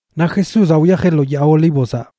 Naꞌ Jesúzaꞌ wyajeꞌ lo Yaa Olívozaꞌ.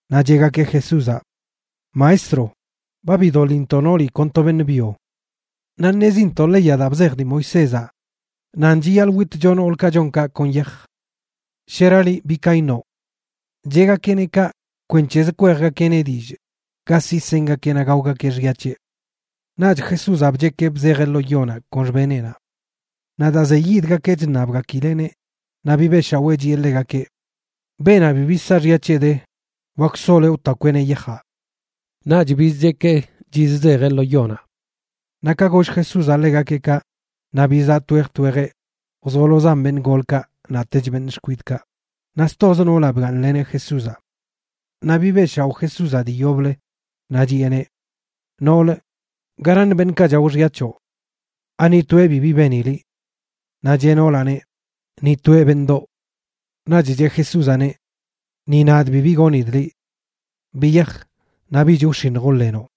Naꞌ cheꞌgakeꞌ Jesúzaꞌ: ―Maestro, ba bidoḻintoꞌ nooli kon to beṉꞌ byo. Naꞌ ṉezintoꞌ leyaꞌ daa bzej dii Moisézaꞌ nan chiyaḻꞌ witcho noolkaꞌ chon kaꞌ kon yaj. ¿Shera liꞌ, bi ka iṉoꞌ? Cheꞌgakeꞌneꞌ kaꞌ kwenc̱hez kwejgakeꞌneꞌ dillꞌ ga siꞌ sengakeꞌ naꞌ gaogakeꞌ xya c̱heꞌ. Naꞌch Jesúzaꞌ bchekee bzejeꞌ lo yonaꞌ kon xbeneꞌnaꞌ. Naꞌ daa zeyidgakeꞌ chṉabgakileꞌneꞌ, naꞌ bibeꞌshawee chiꞌe ḻegakeꞌ: ―Beenaꞌ bibi saaxya c̱heꞌ de, wak soloeꞌ wtakweꞌneꞌ yajaꞌ. Naꞌch bizchekee chizzejeꞌ lo yonaꞌ. Naꞌ ka goll Jesúzaꞌ ḻegakeꞌ kaꞌ, naꞌ bizaꞌ twej twejeꞌ, wzolozan beṉꞌ golkaꞌ naꞌtech beṉꞌ xkwidꞌkaꞌ, naꞌ stoz noolaꞌ bgaaṉleneꞌ Jesúzaꞌ. Naꞌ bibeꞌshaoꞌ Jesúzaꞌ dii yoblə, naꞌ chiꞌeneꞌ: ―Noolə, ¿garaṉ beṉꞌkaꞌ chao xya c̱hoꞌ? ¿Ani toeꞌ bibi beni liꞌ? Naꞌ cheꞌ noolaꞌneꞌ: ―Ni toeꞌ, beṉꞌdoꞌ. Naꞌch cheꞌ Jesúzaꞌneꞌ: ―Ni nadꞌ bibi gonidꞌ liꞌ. Biyaj, naꞌ bich wx̱iṉj wḻenoꞌ.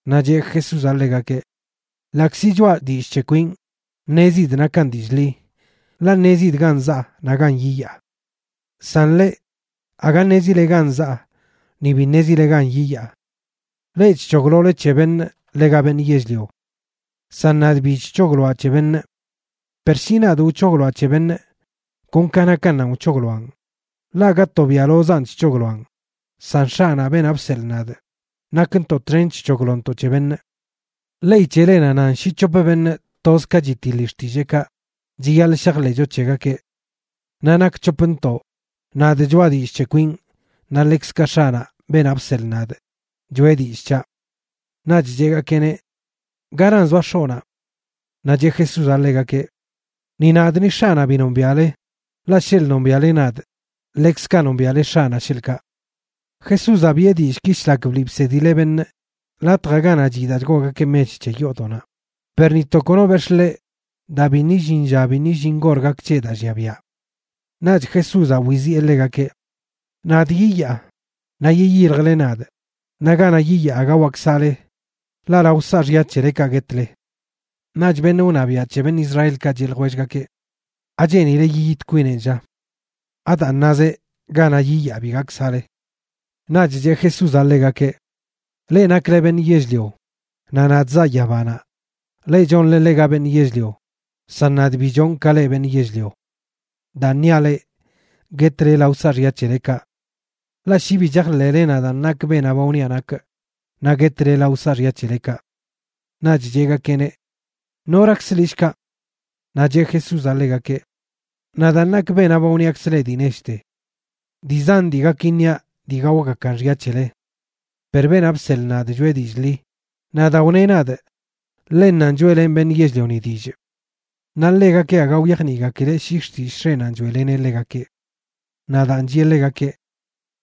Naꞌ cheꞌ Jesúzaꞌ ḻegakeꞌ: ―Ḻaꞌkzi choaꞌ dillꞌ c̱he kwinꞌ, ṉezidꞌ nakan dillꞌ ḻi, ḻaꞌ ṉezidꞌ gan zaa naꞌ gan yiyaa. San leꞌ, aga ṉezile gan zaa, ni bi ṉezile gan yiyaa. Leꞌ chc̱hoglole c̱he beṉꞌ ḻega beṉꞌ yell-lio. San nadꞌ bi chc̱hogloaꞌ c̱he beṉꞌ. Per shi nadꞌ wc̱hogloaꞌ c̱he beṉꞌ, kon ka nakannanꞌ wc̱hogloaꞌn, ḻaꞌ aga tobiaꞌlozaan chc̱hogloaꞌn, san X̱aꞌnaꞌ, beenaꞌ bseḻꞌ nadꞌ, nakntoꞌ txen chc̱hoglontoꞌ c̱he beṉꞌ. Ley c̱helenaꞌ nan shi c̱hop beṉꞌ toz ka chitiḻi xtilleekaꞌ chiyaḻꞌ shajḻeꞌcho c̱hegakeꞌ. Naꞌ nak c̱hopntoꞌ, nadꞌ choꞌa dillꞌ c̱he kwinꞌ, naꞌ ḻekzkaꞌ X̱aꞌnaꞌ, beenaꞌ bseḻꞌ nadꞌ, choꞌe dillꞌ c̱haꞌ. Naꞌch cheꞌgakeꞌneꞌ: ―¿Garan zoa X̱oꞌnaꞌ? Naꞌ cheꞌ Jesúzaꞌ ḻegakeꞌ: ―Ni nadꞌ ni X̱aꞌnaꞌ bi nombiaꞌle. Ḻaꞌ sheḻꞌ nombiaꞌle nadꞌ, ḻekzkaꞌ nombiaꞌle X̱aꞌnaꞌ, sheḻꞌkaꞌ. Jesúzaꞌ biꞌe dillꞌki shlak bliꞌ bsedileꞌ beṉꞌ latjaꞌ ganaꞌ chiꞌ daa chgoogakeꞌ mech c̱he yoodoꞌnaꞌ, per ni to kono bex̱ꞌ ḻeꞌ daa biṉꞌ illin lla biṉꞌ illin gor gak c̱heꞌ daa llia biaꞌ. Naꞌch Jesúzaꞌ wiziꞌe ḻegakeꞌ: ―Nadꞌ yiyaa, naꞌ yiyiljle nadꞌ, naꞌ ganaꞌ yiyaa aga wak saꞌle, ḻaꞌ lao saaxya c̱helekaꞌ guetle. Naꞌch beṉꞌ wṉabiaꞌ c̱he beṉꞌ Israelkaꞌ cheꞌ ljwellgakeꞌ: ―¿Acheenileꞌ yiyit kwinenꞌ, lla? ¿Adaan nazeꞌ: “Ganaꞌ yiyaa bi gak saꞌle”? Naꞌch cheꞌ Jesúzaꞌ ḻegakeꞌ: ―Leꞌ nakle beṉꞌ yell-lio, naꞌ nadꞌ zaa yabanaꞌ. Leꞌ chonle ḻega beṉꞌ yell-lio, san nadꞌ bi chonꞌ ka leꞌ beṉꞌ yell-lio. Daan niaꞌ leꞌ, guetle lao saaxya c̱helekaꞌ. Ḻaꞌ shi bi chajḻeꞌle nadaan nakꞌ beenaꞌ ba wniaꞌ nakꞌ, naꞌ guetle lao saaxya c̱helekaꞌ. Naꞌch cheꞌgakeꞌneꞌ: ―¿Norakzə liꞌ, shkaꞌ? Naꞌ cheꞌ Jesúzaꞌ ḻegakeꞌ: ―Nadaan nakꞌ beenaꞌ ba wṉiakzꞌ leꞌ dii nechte. Dii zan dii gak iṉiaꞌ dii gaogakan xya c̱hele. Per beenaꞌ bseḻꞌ nadꞌ choꞌe dillꞌ ḻi, naꞌ daa wneꞌ nadꞌ ḻennanꞌ choeꞌlenꞌ beṉꞌ yell-lioni dillꞌ. Naꞌ ḻegakeꞌ aga wyajniꞌgakileꞌ shi xtillꞌ X̱eꞌnanꞌ choeꞌleneꞌ ḻegakeꞌ. Naꞌ daan chiꞌe ḻegakeꞌ: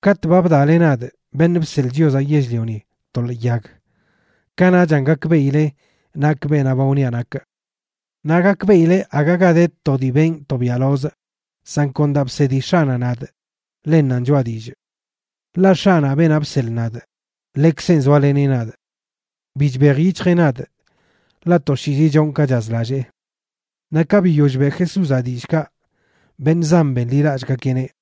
―Katꞌ ba bdaꞌle nadꞌ, Beṉꞌ Bseḻꞌ Chiozaꞌ Yell-lioni, to ḻee yag, kanaꞌchan gakbeꞌile nakꞌ beenaꞌ ba wniaꞌ nakꞌ. Naꞌ gakbeꞌile aga ga de to dii benꞌ to biaꞌlozꞌ, san kon daa bsedi X̱aꞌnaꞌ nadꞌ, ḻennanꞌ choꞌa dillꞌ. Ḻaꞌ X̱aꞌnaꞌ, beenaꞌ bseḻꞌ nadꞌ, ḻekzenꞌ zoaleneꞌ nadꞌ. Bi chbej yic̱hjeꞌ nadꞌ, ḻaꞌ toshiizi chonꞌ ka chazlallee. Naꞌ ka biyoll beꞌ Jesúzaꞌ dillꞌkaꞌ, beṉꞌ zan benḻilallꞌgakeꞌneꞌ.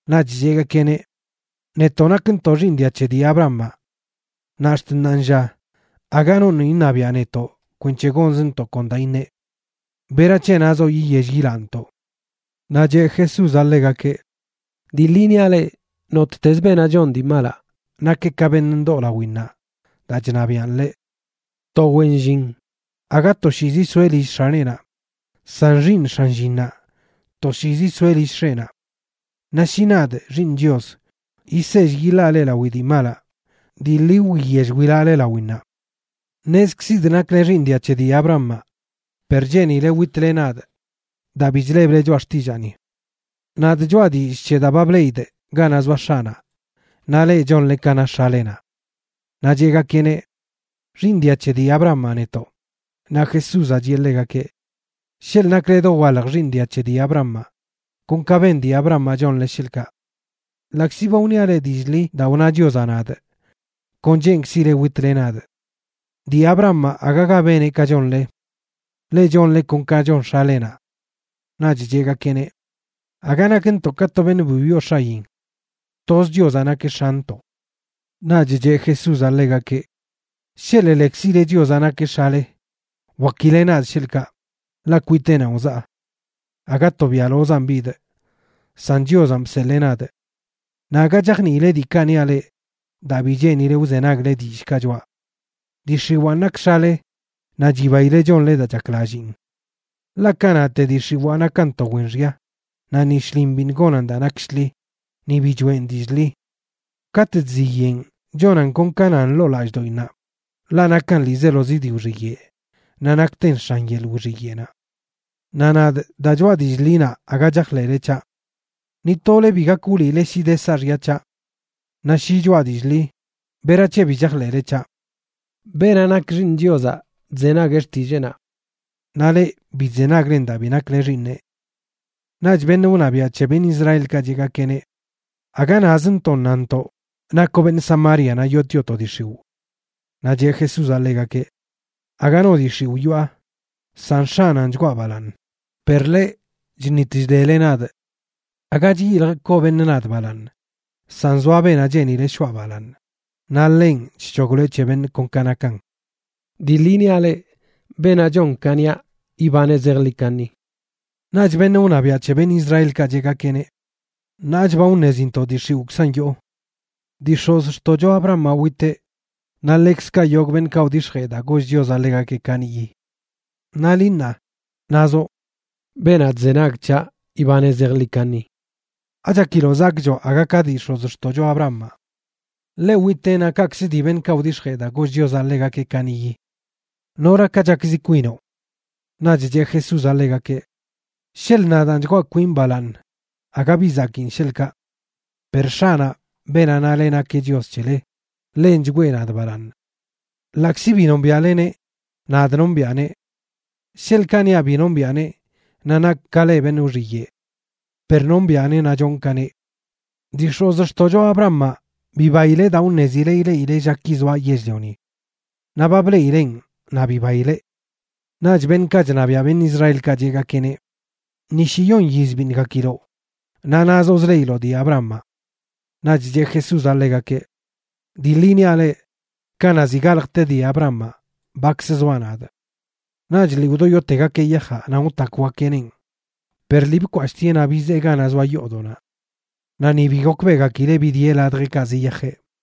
Naꞌch cheꞌgakeꞌneꞌ: ―Netoꞌ nakntoꞌ xiiṉ dia c̱he dii Abrahamaꞌ naꞌ ax̱t ṉaanlla aga noṉꞌ iṉabiaꞌ netoꞌ kwenc̱he gonzntoꞌ kon daa iṉeꞌ. ¿Berac̱he nazoꞌ yiyell yilaꞌntoꞌ? Naꞌ cheꞌ Jesúzaꞌ ḻegakeꞌ: ―Dii ḻi niaꞌ leꞌ, nottez beenaꞌ chon dii malaꞌ nakeꞌ ka beṉꞌ ndoo lawinnaꞌ daa chṉabiꞌan ḻeꞌ. To wen llin aga toshiizi soeꞌ lill x̱aneꞌnaꞌ, san xiiṉ x̱an llinnaꞌ, toshiizi soeꞌ lill x̱eꞌnaꞌ. Naꞌ shi nadꞌ, Xiiṉ Chios, yisell yiḻaa leꞌ lawi dii malaꞌ, dii ḻi wiyell wilaꞌle lawinnaꞌ. Ṉezkzidꞌ nakle xiiṉ dia c̱he dii Abrahamaꞌ, per cheenile witle nadꞌ daa bi chleble choꞌa xtillaani. Nadꞌ choꞌa dillꞌ c̱he daa ba bleꞌidꞌ ganaꞌ zoa X̱aꞌnaꞌ, naꞌ leꞌ, chonle ka na x̱alenaꞌ. Naꞌ cheꞌgakeꞌneꞌ: ―Xiiṉ dia c̱he dii Abrahamaꞌ netoꞌ. Naꞌ Jesúzaꞌ chiꞌe ḻegakeꞌ: ―Sheḻꞌ nakle dowalj xiiṉ dia c̱he dii Abrahamaꞌ, kon ka ben dii Abrahamaꞌ chonle, sheḻꞌkaꞌ. Ḻaꞌkzi ba wniaꞌ leꞌ dillꞌ ḻi daa wna Chiozaꞌ nadꞌ, kon cheenkzile witle nadꞌ. Dii Abrahamaꞌ agaga beneꞌ ka chonle. Leꞌ chonle kon ka chon x̱alenaꞌ. Naꞌch cheꞌgakeꞌneꞌ: ―Aga nakntoꞌ ka to beṉꞌ bi wyoo x̱ayin. Toz Chiozaꞌ nakeꞌ X̱antoꞌ. Naꞌch cheꞌ Jesúzaꞌ ḻegakeꞌ: ―Sheḻꞌ lekzile Chiozaꞌ nakeꞌ X̱ale, wakile nadꞌ sheḻꞌkaꞌ, ḻaꞌ kwiteꞌnanꞌ wzaa. Aga tobiaꞌlozaan bidꞌ, san Chiozanꞌ bseḻee nadꞌ. Naꞌ aga chajniile diikaꞌ niaꞌ leꞌ daa bi cheenile wzenagle dillꞌkaꞌ choꞌa. Dii x̱iwaan nak x̱ale naꞌ chibaile chonle daa chaklalliin. Ḻaꞌ kanaꞌte dii x̱iwaa nakan to wen xya, naꞌ ni shlin biṉꞌ gonan daa nak shḻi, ni bi choeꞌn dillꞌ ḻi. Katꞌ chziyeꞌn chonan kon ka nan ḻoo lallꞌdoꞌinnaꞌ, ḻaꞌ nakan ḻiizelozi dii wxiyeꞌ naꞌ nakten x̱an yeḻꞌ wxiyeꞌnaꞌ. Naꞌ nadꞌ, daa choꞌa dillꞌ ḻinaꞌ aga chajḻeꞌle c̱haꞌ. Ni tole bi gak wliꞌle shi de saaxya c̱haꞌ. Naꞌ shi choꞌa dillꞌ ḻi, ¿berac̱he bi chajḻeꞌle c̱haꞌ? Beenaꞌ nak xiiṉ Chiozaꞌ chzenagueꞌ xtilleenaꞌ. Naꞌ leꞌ, bi chzenaglen daa bi nakle xiiṉeꞌ. Naꞌch beṉꞌ wṉabiaꞌ c̱he beṉꞌ Israelkaꞌ cheꞌgakeꞌneꞌ: ―¡Aga nazntoꞌ nantoꞌ nakoꞌ beṉꞌ Samaria naꞌ yootioꞌ to dii x̱iwꞌ! Naꞌ cheꞌ Jesúzaꞌ ḻegakeꞌ: ―Aga no dii x̱iwꞌ yoꞌa, san X̱aꞌnanꞌ chgwaa balaaṉ, per leꞌ, chṉit chdele nadꞌ. Aga chyiljꞌ koo beṉꞌ nadꞌ balaaṉ. San zoa beenaꞌ cheeni shoꞌa balaaṉ, naꞌ ḻenꞌ chc̱hogloeꞌ c̱he beṉꞌ kon ka nakan. Dii ḻi niaꞌ leꞌ, beenaꞌ chon ka niaꞌ, ibaneꞌ zejḻi kaṉi. Naꞌch beṉꞌ wṉabiaꞌ c̱he beṉꞌ Israelkaꞌ cheꞌgakeꞌneꞌ: ―Ṉaach ba wṉezintoꞌ dii x̱iwꞌkzan yoo. Dii x̱ozxtoꞌcho Abrahamaꞌ witeꞌ naꞌ ḻekzkaꞌ yogꞌ beṉꞌkaꞌ wdix̱jee daa goll Chiozaꞌ ḻegakeꞌ kaniꞌyi. Naꞌ liꞌ ṉaa, nazoꞌ: “Beenaꞌ chzenag c̱haꞌ ibaneꞌ zejḻi kaṉi.” ¿Achakiloꞌ zakꞌchoꞌ aga ka dii x̱ozxtoꞌcho Abrahamaꞌ? Ḻeꞌ witeꞌ naꞌ kaꞌkzə dii beṉꞌkaꞌ wdix̱jee daa goll Chiozaꞌ ḻegakeꞌ kaniꞌyi. ¿Noraka chakzi kwinoꞌ? Naꞌch cheꞌ Jesúzaꞌ ḻegakeꞌ: ―Sheḻꞌ nadaan chgwaa kwinꞌ balaaṉ aga bi zakiin, sheḻꞌkaꞌ. Per X̱aꞌnaꞌ, beenaꞌ nale nakeꞌ Chios c̱hele, ḻenꞌ chgwee nadꞌ balaaṉ. Ḻaꞌkzi bi nombiaꞌleneꞌ, nadꞌ nombiꞌaneꞌ. Sheḻꞌkaꞌ niaꞌ bi nombiꞌaneꞌ, naꞌ nakꞌ ka leꞌ beṉꞌ wxiyeꞌ. Per nombiꞌaneꞌ naꞌ chonꞌ ka neꞌ. Dii x̱ozxtoꞌcho Abrahamaꞌ bibaileꞌ daa wṉezileꞌ ileꞌileꞌ llaki zoaꞌ yell-lioni. Naꞌ ba bleꞌileꞌn naꞌ bibaileꞌ. Naꞌch beṉꞌkaꞌ chṉabiaꞌ beṉꞌ Israelkaꞌ cheꞌgakeꞌneꞌ: ―Ni shiyon yiz biṉꞌ gakiloꞌ naꞌ nazoꞌ zleꞌiloꞌ dii Abrahamaꞌ. Naꞌch cheꞌ Jesúzaꞌ ḻegakeꞌ: ―Dii ḻi niaꞌ leꞌ, kanaꞌ ziꞌ galjte dii Abrahamaꞌ, bakz zoaꞌ nadꞌ. Naꞌch lii wdoyotegakeꞌ yajaꞌ nan wtakwgakeꞌneꞌn, per lii bkwashꞌtieꞌ naꞌ bizee ganaꞌ zoa yoodoꞌnaꞌ. Naꞌ ni bi gokbeꞌgakileꞌ bidieꞌ ladjeꞌkaꞌ ziyajeꞌ.